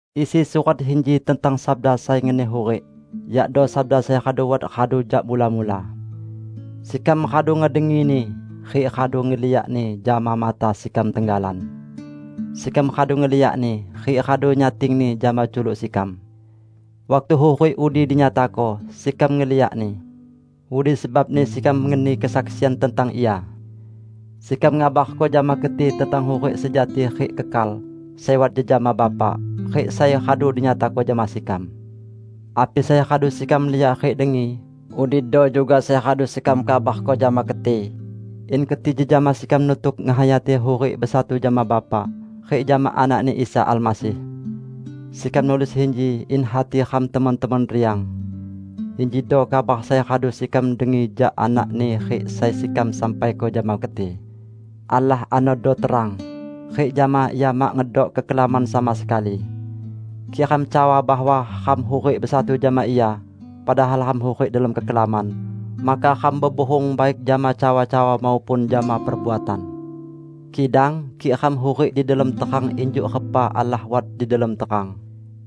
Isi surat inji tentang Sabda sai ngeni hurik, yakdo Sabda sai radu wat radu jak mula-mula. Sekam radu ngedengini, rik radu ngeliakni jama mata sekam tenggalan. Sekam radu ngeliakni, rik radu nyatingni jama culuk sekam. Waktu hurik udi dinyatako, sekam ngeliakni. Udi sebabni sekam ngeni kesaksian tentang ia. Sekam ngabarko jama keti tentang hurik sejati rik kekal, sai wat jejama Bapa, rik sai radu dinyatako jama sekam. Api sai radu sekam liak rik dengi, udido juga sai radu sekam kabarko jama keti, in keti jejama sekam nutuk ngehayati hurik besatu jama Bapa, rik jama Anak-Ni Isa Almasih. Sekam nulis inji in hati ram temon-temon riang. Injido kabar sai radu sekam dengi jak Anak-Ni rik sai sekam sampaiko jama keti: Allah anodo terang, rik jama Ia mak ngedok kekelaman sama sekali. Kik ram cawa bahwa ram hurik besatu jama Ia, padahal ram hurik delom kekelaman, maka ram bebuhung baik jama cawa-cawa maupun jama perbuatan. Kidang kik ram hurik di delom terang injuk repa Allah wat di delom terang,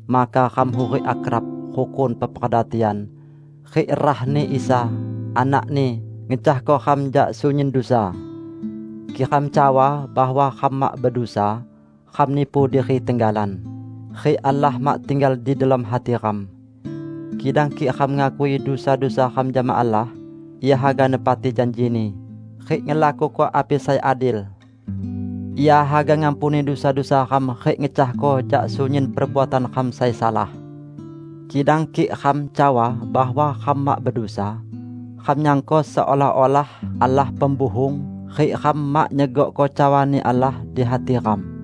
maka ram hurik akrab, rukun peperda tian, rik rah-Ni Isa, Anak-Ni, ngecahko ram jak sunyin dusa. Kik ram cawa bahwa ram mak bedusa, ram nipu diri tenggalan; rik Allah mak tinggal di delom hati ram. Kidang kik ram ngakui dusa-dusa ram jama Allah, Ia haga nepati janji-Ni rik ngelakuko api sai adil. Ia haga ngampuni dusa-dusa ram rik ngecahko jak sunyin perbuatan ram sai salah. Kidang kik ram cawa bahwa ram mak bedusa, ram nyangko seolah-olah Allah pembuhung rik ram mak nyegokko cawa-Ni Allah di hati ram.